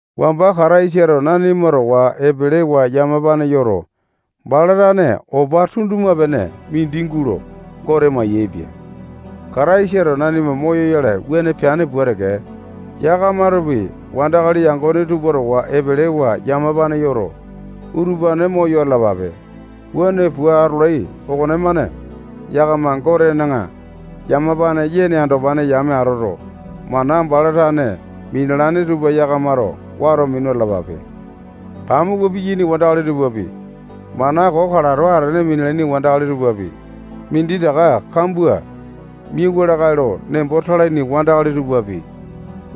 Wamba Kataisato nanima towa epelewa yamapane yoto, bala tane opa tunduma-pene mindi gulo Gote mayaepia. Kataisato nanima moyoyale wuane peane pua teke, yakamatopi wandakali yangone tupa towa epelewa yamapane yoto, utupane moyo atalapape. Wuane pua atolai okonemane, yakama Gotena yamapane yene andopane yame atoto, mana bala tane minalane tupa yakamato wato minu atalapape. Pamuku piyaini wandakali tupapi, mana koo kalato atene minalaini wandakali tupapi, minditaka kambua miawa lakae lo nembo talaini wandakali tupapi,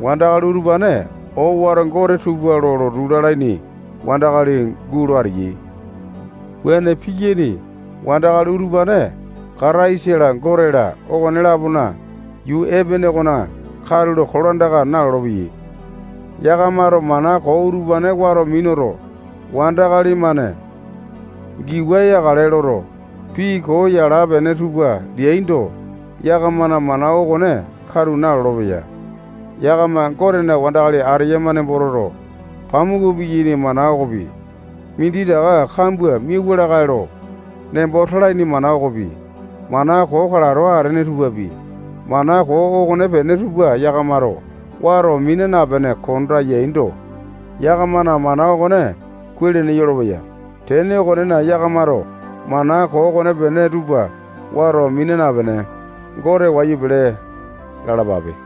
wandakali utupane owato gote tupa lo lotu lalaini wandakali gulo ateyai. Wuane piyaini wandakali utupane Kataisa-la, Gote-la, okone-lapona yuu epene okona katulo kolandaka nalolo-peyai. Yakamato mana koo utupane wato minuto, wandakali-mane giwa yakale loto, pii koo yala-pene tupa leaindo, yakamana mana okone katu nalolo-peya. Yakama Gotena wandakali ateyama nembo toto, pamuku piyaini mana okopi, minditaka kambua miauwa lakae lo nembo talaini mana okopi, mana koo kalato atene tupapi, mana koo okonepene tupa yakamato wato mina napene konda yaindo, yakamana mana okone kuai-lene yolopeya. Tene okonena, yakamato mana koo okonepene tupa wato mina napene, Gote wayu pele lalapape.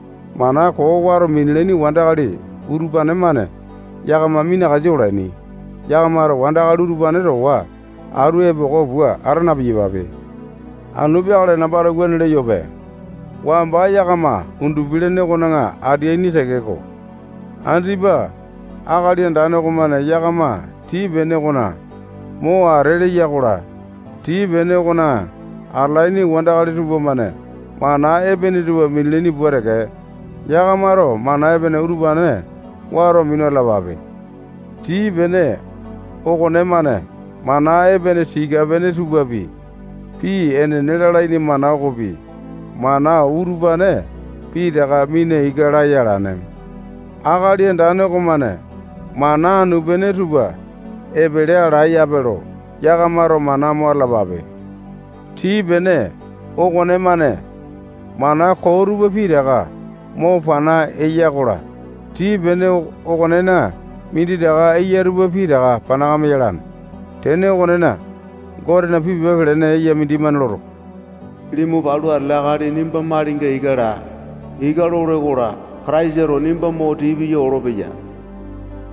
Mana koo wato minalaini wandakali utupane-mane yakama minakasa olaini. Yakamato wandakali utupane towa atu epoko pua ata na-piyapape. Anu peakale nambato wuane leyope. Wamba yakama undupi-lene okona ateaini tekeko, andipa Akali Andane okomane yakama tii-pene okona mo ate leya-kola, tii-pene okona atalaini wandakali tupamane mana epene tupa minalaini pua teke, yakamato mana epene utupane wato minu atalapape. Tii pene okonemane mana epene tika pene tupapi, pii enene lalaini mana okopi, mana utupane pitaka mina ika laya alane. Akali Andane okomane mana anu-pene tupa epele alane yape lo yakamato mana mo atalapape. Tii pene okonemane mana koo tupa pitaka mo pana eya-kola, tii-pene okonena minditaka eya tupa pitaka panakame yalane. Tene okonena, Gotena pii pepa pelene eya mindimane loto, limu palu atele akali nimba malinga ika laa. Ika lole-kola, Kataisato nimba mo tii piya olopeya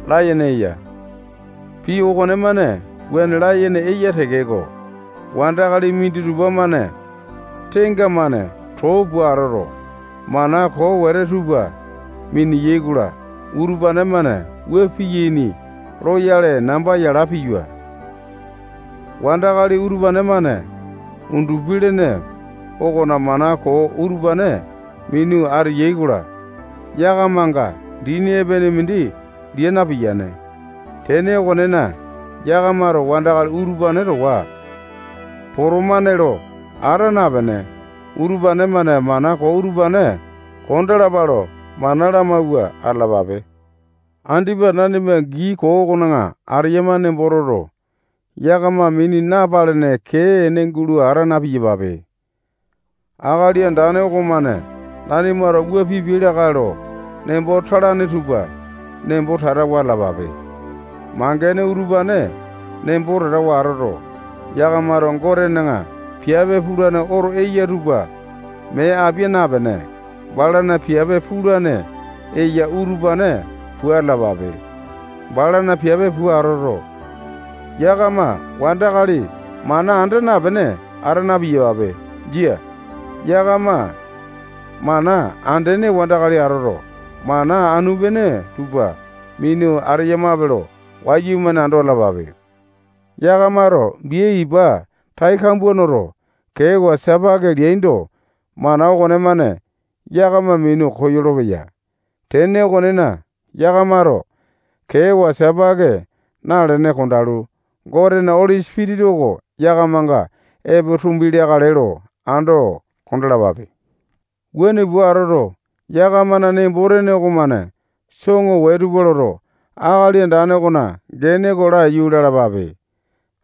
layene eya. Pii okonemane wuane layene eya tekeko, wandakali minditupa-mane tenga-mane too pua atoto, mana koo wete tupa miniyai-kola, utupane-mane wua piyaini loyale namba yala piyua. Wandakali utupane-mane undupi-lene okona mana koo utupane minu ateyai-kola, yakamanga dini epene mindi lia napiyane. Tene okonena, yakamato wandakali utupane towa potomane lo ata napene, utupane-mane mana koo utupane kondalapa lo mana lamawua atalapape. Andipa nanima gii koo okona ateyama nembo toto, yakama mini napalene kee ene gulo ata na-piyapape. Akali Andane okomane nanimato wua pipiai lakae lo nembo talane tupa nembo tatawa atalapape. Mangene utupane nembo tatawa atoto, yakamato Gotena piape pulane oto eya tupa mee apia napene, balana piape pulane eya utupane pua atalapape. Balana piape pua atoto, yakama mana anda napene wandakali ata na-piyapape. Jia. Yakama mana andene wandakali atoto, mana anu-pene tupa minu ateyamape lo wayumane ando atalapape. Yakamato bia ipa tai kambua noto, kewa sipaki leaindo, mana okonemane yakama minu koyolo-peya. Tene okonena, yakamato kewa sipaki nalene kondalu, Gotena Oli Sipitisa oko yakamanga epo tumbi leakale lo ando kondalapape. Wuane pua atoto, yakamana nembo-tene okomane soŋo wee tupa loto, Akali Andane okona gene oko laiyu lalapape.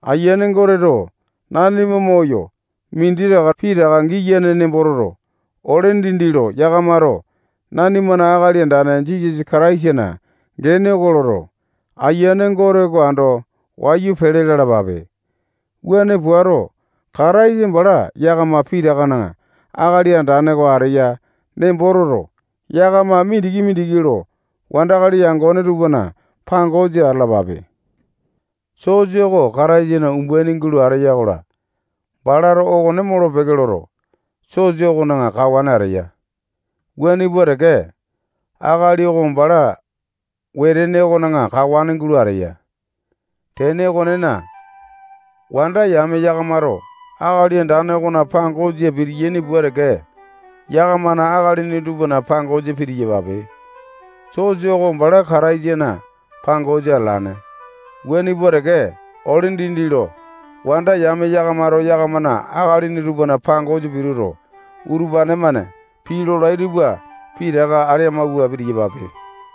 Ayiane Goteto nanima moyo minditaka pitaka taka giyane nembo toto, ole dindi lo yakamato nanimana Akali Andane Jisasa Kataisana gene oko loto, Ayiane Gote oko ando wayu pele lalapape. Wuane puato, Kataisa bala yakama pitakana Akali Andane oko ateya nembo toto, yakama mindiki-mindiki lo wandakali yangone tupana pangosa atalapape. Sosa oko Kataisana umbaini gulo ateya-kola, balato okone molo-peke loto, sosa okona kawane ateya. Wuane pua teke, akali oko bala wetene okona kawane gulo ateya. Tene okonena, wanda yame yakamato Akali Andane okona pangosa pitiyaini pua teke, yakamana akalini tupana pangosa pitiyapape. Sosa oko bala Kataisana pangosa atalane. Wuane pua teke, ole dindi lo wanda yame yakamato yakamana akalini tupana pangosa pituto, utupane-mane pii lolai tupa pitaka ale amawua pitiyapape.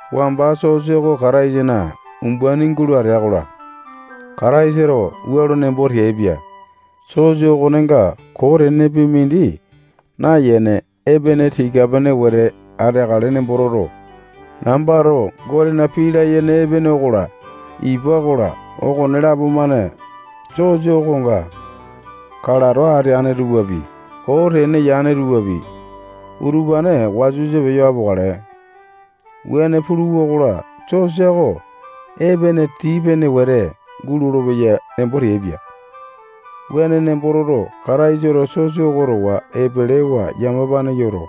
Wamba sosa oko Kataisana umbaini gulo atea-kola, Kataisato wua lo nembo teaipia. Sosa okonenga koo tenepi mindi nayene, epene tika-pene wete ateakale nembo toto, nambato Gotena pii layene epene okola, ipa okola, okonelapo-mane sosa okonga kalato ateane tupapi, koo tene yane tupapi, utupane wasa-wasa peyo apokale. Wuane puluwa-kola, sosa oko epene tii-pene wete gulolo-peya nembo teaipia. Wuane nembo toto, Kataisato sosa oko towa epelewa yamapane yoto,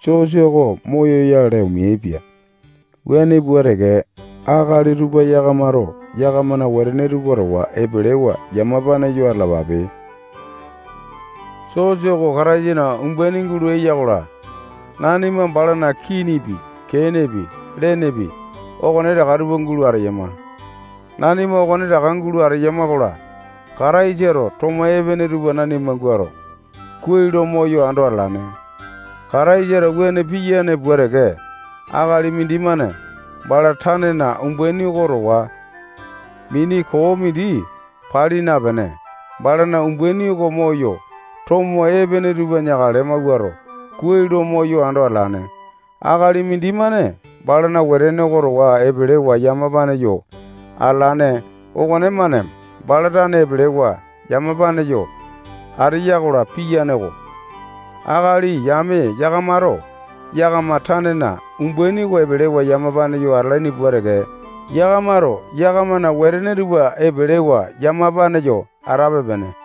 sosa oko moyoyale omeaipia. Wuane pua teke, akali tupa yakamato yakamana wetene tupa towa epelewa yamapane yo atalapape. Sosa oko Kataisana umbaini gulo eya-kola, nanima balana kinipi, kenepi, lenepi, okonetaka tupa gulo ateyama. Nanima okonetaka gulo ateyama-kola, Kataisato tomo epene tupa nanima guato, kuai lo moyo ando atalane. Kataisato wuane piyane pua teke, akali mindimane bala tanena umbaini oko towa mini koo mindi pali napene, balana umbaini oko moyo, tomo epene tupa neakale mawuato, kuai lo moyo ando atalane. Akali mindimane balana wetene oko towa epelewa yamapane yo atalane okonemane bala tane epelewa yamapane yo ateya-kola, piyane-ko. Akali yame yakamato yakama tanena umbaini oko epelewa yamapane yo atalaini pua teke, yakamato yakamana wetene tupa epelewa yamapane yo atape-pene.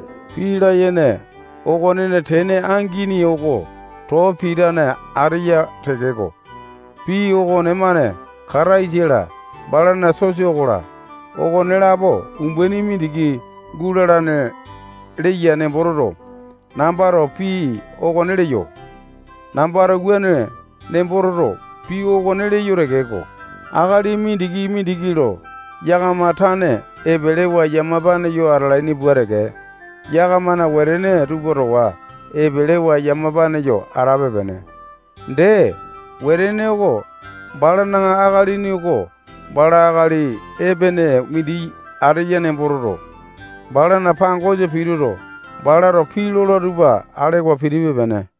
Pii layene okonena tene angini oko too pitane ateya tekeko, pii okonemane Kataisa-la, balana sosa okola, okonelapo umbaini mindiki gulalane leya nembo toto, nambato pii okone leyo. Nambato wuane nembo toto, pii okone leyo tekeko, akali mindiki-mindiki lo yakama tane epelewa yamapane yo atalaini pua teke, yakamana wetene tupa towa epelewa yamapane yo atape-pene. Dee, wetene oko balana akalini oko bala akali epene mindi ateya nembo toto, balana pangosa pituto, balato pii lola tupa alewa pitipe-pene.